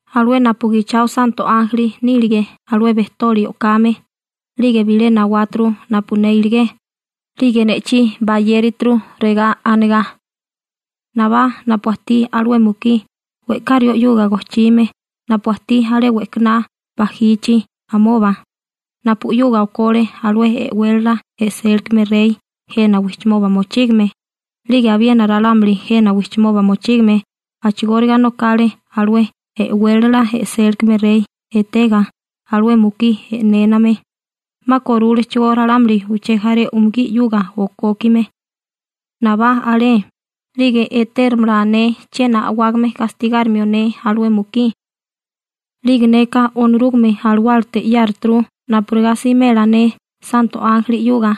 Alué napu gichao santo ánjeli nílige alué bejtoli o'kame, 'lige bilé nawáturu napu ne iligé, 'lige ne'chí bayérituru regá anigá: ―Nabá napu ajtí alué mukí we'ká rió 'yuga gojchime napu ajtí alé we'kaná bajichi amoba, napu 'yuga okole alué e'wélala e'sélikame rey jena wijchimoba mochígame, 'lige abiena ralámuli jena wijchimoba mochígame a'chigóriga nokale alué e'wélala e'sélikame rey etega alué mukí e'néname, 'ma korúlechigó ralámuli uché jaré umugí 'yuga okókime. Nabá alé, 'lige etérimala ne chiena a'wágame gastigárimio ne alué mukí. 'Lige neka Onorúgame Alawálate 'yáruturu napurigá simela ne santo ánjeli 'yuga.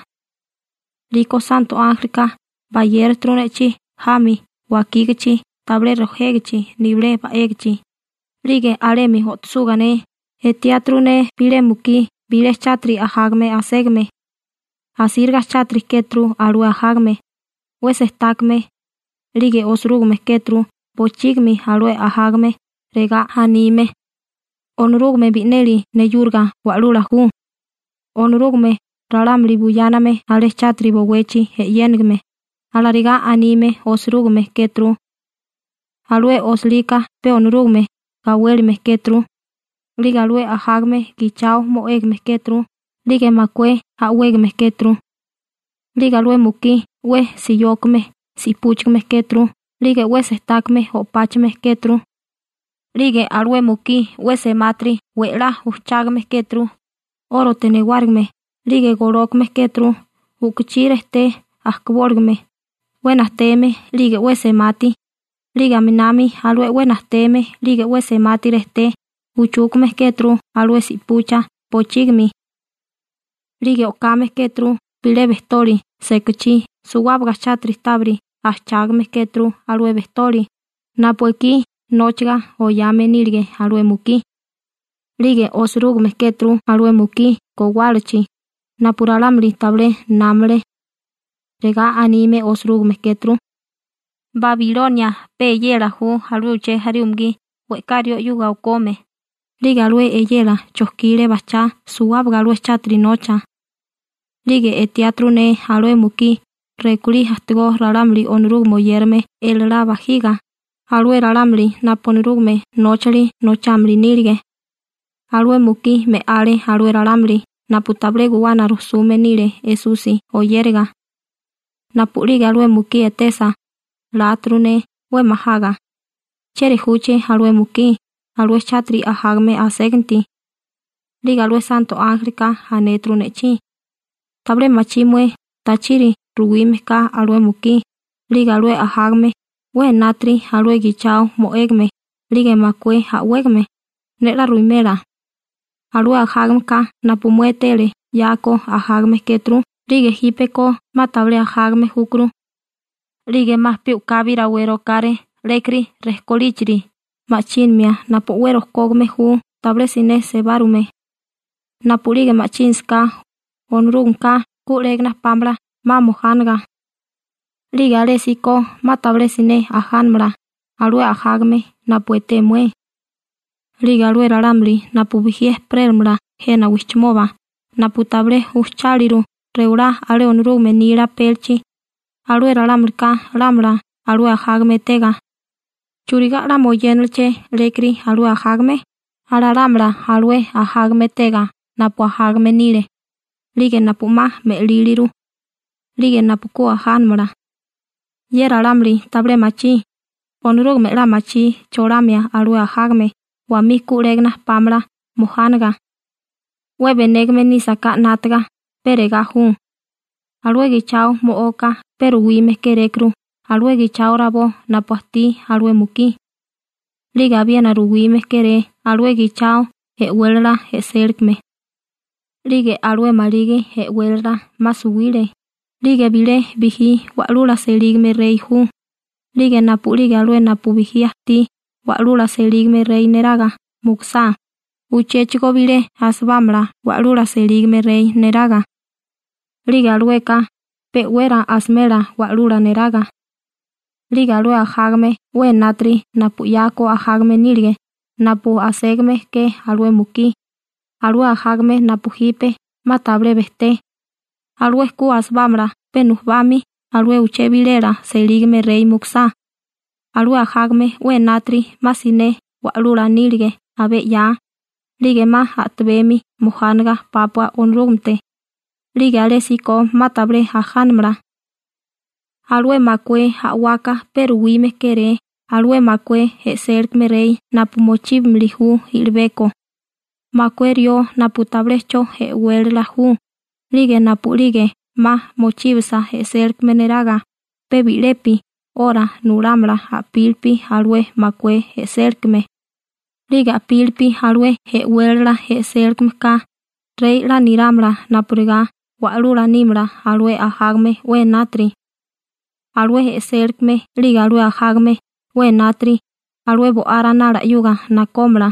'Liko santo ánjelika bayérituru ne'chí jami wakígachi tabilé rojégichi nibilé ba'égichi. 'Lige alemi o'tosuga ne, etiáturu ne bilé mukí bilé chátiri ajágame aségame. Asíriga chátiri kéturu alué ajágame, 'we sejtákame. 'Lige osirúgime kéturu bochígimi alué ajágame, regá anime: «Onorúgame bi'neli neyúriga Wa'lula ju, Onorúgame ralámuli buyáname alé chátiri bowechi e'yénigime», alarigá anime osirúgime kéturu. Alué osilika pe Onorúgame gawélime kéturu. 'Lige alué ajágame gichao mo'égame kéturu 'lige makué a'wégame kéturu. 'Lige alué mukí 'we siyókame si'púchigame kéturu 'lige 'we sejtákame o'páchame kéturu. 'Lige alué mukí 'we semátiri we'lá ujchágame kéturu, 'órote newárigime, 'lige golókame kéturu u'kuchí rejté ajkabóligame 'we najteme 'lige 'we semati, 'lige aminami alué 'we najteme 'lige 'we semati rejté uchúkame kéturu alué si'pucha bochígimi. 'Lige o'kame kéturu bilé bejtoli sekachí suwábaga chátiri tábiri ajchágame kéturu alué bejtoli napu ekí nóchiga oyame nílige alué mukí. 'Lige osirúgime kéturu alué mukí gowálachi, napu ralámuli tabilé námale. Regá anime osirúgime kéturu: «Babilonia pe eyela ju alué uché jaré umugí we'ká rió 'yuga okome, 'lige alué eyela chojkile bajchá suwábaga alué chátiri nocha.» 'Lige etiáturu ne alué mukí rekulí ajtigó ralámuli Onorúgame oyérame elalá bajiga, alué ralámuli napu Onorúgame nóchali nochámili nílige. Alué mukí me'ale alué ralámuli napu tabilé guwana rujsume nile Esusi oyériga. Napu'lige alué mukí etesa, láturu ne 'we majaga: «¿Chieri júché alué mukí alué chátiri ajágame aséganti?» 'Lige alué santo ánjelika anéturu ne'chí: ―¿Tabilé machí mué tachiri ruwime ka alué mukí 'lige alué ajágame 'we enátiri alué gichao mo'égame 'lige makué a'wégame? Ne 'la ruwimela. Alué ajágameka napu mué etele 'yako ajágame kéturu 'lige jípeko 'ma tabilé ajágame júkuru, 'lige 'ma pe u'kabi rawé rokáré 'lékiri rejkolíchiri ma'chínimia napu 'we rojkógame ju tabilé siné sebárume. Napu'lige ma'chínasaká, Onorúgameka ku 'légana pámala 'ma mojánaga. 'Lige alésíko 'ma tabilé siné ajánamala alué ajágame napu eté mué. 'Lige alué ralámuli napu bijí ejperélamala jena wijchimoba napu tabilé ujcháliru rewalá alé Onorúgame nila apélichi, alué ralámulika lámala alué ajágame etega: «¿Churigá 'la moyénaleché 'lékiri alué ajágame?» Alalámala alué ajágame etega napu ajágame nile, 'lige napu 'ma me'líliru, 'lige napu ku ajánamala. Ye ralámuli tabilé machí Onorúgame 'la machí cholamia alué ajágame wamí ku 'légana pámala mojánaga. › 'We benégame nísaká 'nátaga, pe regá ju: Alué gichao mo'oka pe ruwime kérékuru alué gichao rabó napu ajtí alué mukí. 'Lige abiena ruwime kéré alué gichao e'wélala e'sélikame. 'Lige alué maligi e'wélala 'ma suwile, 'lige bilé bijí wa'lula selígame rey ju, 'lige napu'lige alué napu bijí ajtí wa'lula selígame rey neraga mukusá, uchéchigo bilé asibámala wa'lula selígame rey neraga. 'Lige alueka pe'wera asimela wa'lula neraga. 'Lige alué ajágame 'we enátiri napu 'yako ajágame nílige napu aségame ke alué mukí, alué ajágame napu jipe 'ma tabilé bejté, alué ku asibámala pe nujubami alué uché bilela selígame rey mukusá, alué ajágame 'we enátiri 'ma siné wa'lula nílige abé 'ya, 'lige 'ma a'tabemi mojánaga pápua Onorúgamete, 'lige alésíko 'ma tabilé ajánamala. › Alué makué a'waka pe ruwime kéré alué makué e'sélikame rey napu mochíbimili ju i'libeko, makué rió napu tabilé 'cho e'wélala ju, 'lige napu'lige 'ma mochíbasa e'sélikame neraga pe bi'lepi 'ora nulámala a'pílipi alué makué e'sélikame. 'Lige a'pílipi alué e'wélala e'sélikameka rey 'la nerámala napurigá wa'lula nímala alué ajágame 'we enátiri. Alué e'sélikame 'lige alué ajágame 'we enátiri alué Bo'á Ranala 'yuga nakómala,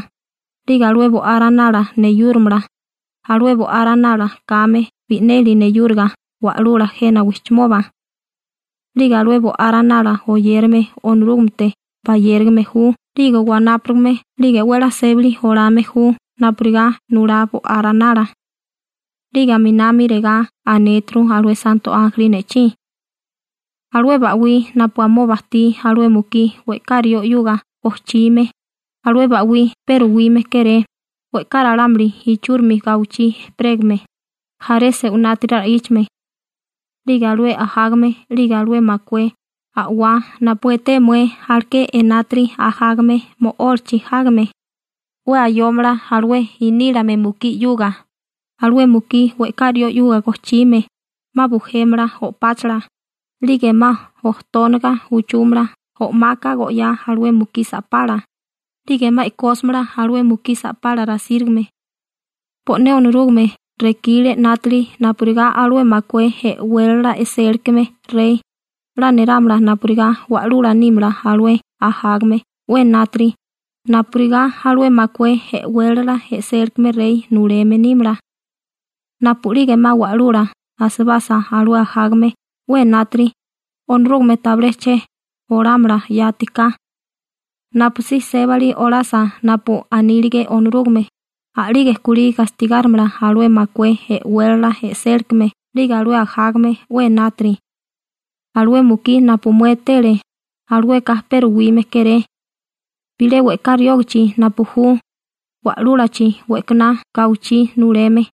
'lige alué Bo'á Ranala neyúrimala, alué Bo'á Ranala kame bi'neli neyúriga Wa'lula jena wijchimoba. 'Lige alué Bo'á Ranala oyérame Onorúgamete bayérigame ju 'lige wanápurigame 'lige 'we 'la sébali olame ju napurigá nulá Bo'á Ranala. 'Lige aminami regá anéturu alué santo ánjeli ne'chí: ―Alué ba'wí napu amoba ajtí alué mukí we'ká rió 'yuga gojchime, alué ba'wí pe ruwime kéré we'ká ralámuli ichúrimi gawichí ejperégame, jaré se'winátiri ra'íchame. 'Lige alué ajágame 'lige alué makué a'wá napu eté mué aleké enátiri ajágame mo'ólachi jágame, 'we ayómala alué inílame mukí 'yuga, alué mukí we'ká rió 'yuga gojchime, 'ma bujémala o'páchala, 'lige 'ma ojtónaga uchúmala o'maka go'yá alué mukí sa'pala, 'lige 'ma e'kósimala alué mukí sa'pala rasírigame. Bo'né Onorúgame rekile 'nátili napurigá alué makué e'wélala e'sélikame rey 'la nerámala napurigá wa'lula nímala alué ajágame 'we enátiri napurigá alué makué e'wélala e'sélikame rey nuleme nímala. Napu'lige 'ma wa'lula asibasa alué ajágame 'we enátiri, Onorúgame tabilé che olámala yati ka, napusí sébali olasa napu anílige Onorúgame, a'lige kulí gastigárimala alué makué e'wélala e'sélikame 'lige alué ajágame 'we enátiri. Alué mukí napu mué etele, alueka pe ruwime kéré bilé we'ká riógachi napu ju wa'lúlachi we'kaná gawichí nuleme.